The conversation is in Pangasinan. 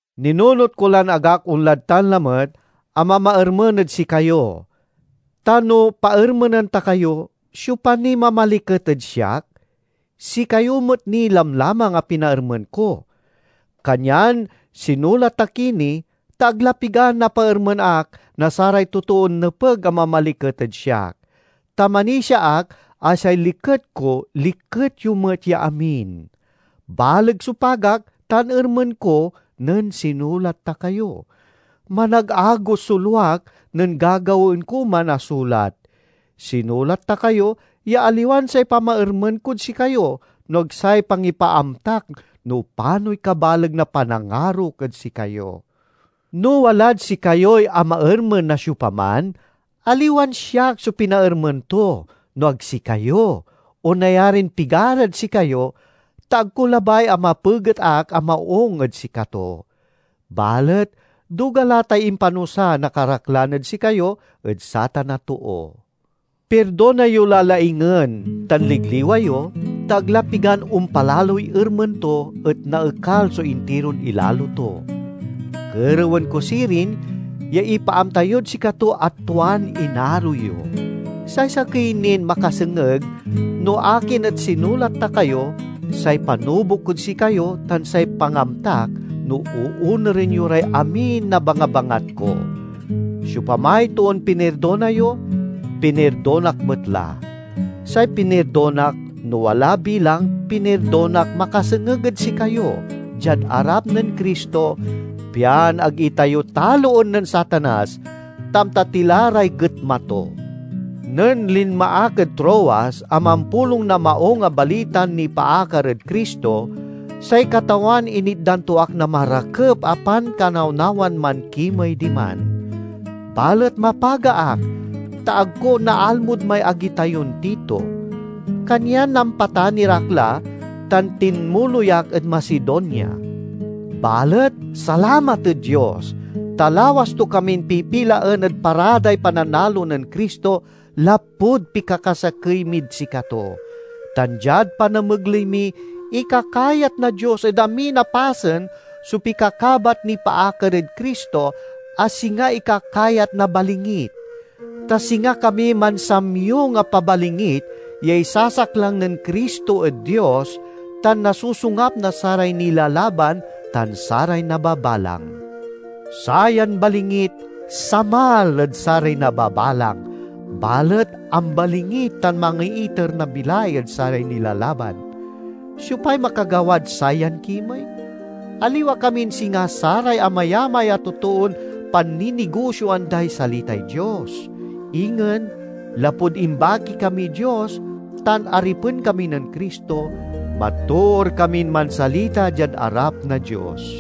Ninunot ko lan ag ak onlad tan lamet a mamaermen ed sikayo. Ta no paermenen ta kayo, siopa niy mamaliket ed siak? Sikayo met ni lamlamang a pinaermen ko! Kanyan sinulat ta ki ni, ta ag la pigan napaermen ak na saray totoon nepeg a mamaliket ed siak. Ta manisia ak a say liket ko liket yo met ya amin. Baleg so pagak tan ermen ko nen sinulat ta kayo. Managagos so luak nen gagawaen ko man a sulat. Sinulat ta kayo ya aliwan say pamaermen kod sikayo, no ag say pangipaaamtak no panoy kabaleg na panangarok ed sikayo. No walad sikayoy amaermen na siopaman, aliwan siak so pinaermen to no ag sikayo, o nayarin pigarad sikayo, ta ag ko labay a mapeget ak a maung ed sikato. Balet duga la tay impanusa na karaklan ed sikayo ed satan a too. Pirdona yo la laingen tan ligliwa yo, ta ag la pigan ompalaloy ermen to, et naekal so intiron ilalo to. Kerewen ko sirin ya ipaamta yod sikato a tuan inaro yo. Say sakey nin makasengeg no akin et sinulat ta kayo, say panubok kod sikayo tan say pangamtak no oonuren yo ray amin a bangabangat ko. Siopamay toon pinirdona yo, pinirdonak met la. Say pinirdonak, no wala bilang, pinirdonak makasengeg ed sikayo, diad arap nen Cristo, pian ag itayo taloen nen Satanas; ta amta ti la ray getma to. Nen linma ak ed Troas a mampulong na Maung a Balitan nipaakar ed Cristo, say Katawan initdan to ak na marakep a pankanawnawan mankimey diman. Balet mapaga ak, ta ag ko naalmod may agi tayon Tito. Kanyan nampatanir ak la, tan tinmuloy ak ed Macedonia. Balet salamat ed Dios, ta lawas to kamin pipilaen ed paraday pananalo nen Cristo, lapud pikakasakey mid sikato. Tan diad panamegley mi, ikakayat na Dios ed amin a pasen so pikakabat nipaakar ed Cristo, a singa ikakayat na balingit. Ta singa kami mansamyong a pabalingit ya isasaklang nen Cristo ed Dios, tan nasosongap na saray nilalaban tan saray nababalang. Sayan balingit samal ed saray nababalang, balet ambalingit tan mangiiter na bilay ed saray nilalaban. Siopay makagawad sayan kimey? Aliwa kamin singa saray amayamay a totoon panninigosioan day salitay Dios. Ingen, lapud imbaki kamiy Dios tan aripen kami nen Cristo, matoor kamin mansalita diad arap na Dios.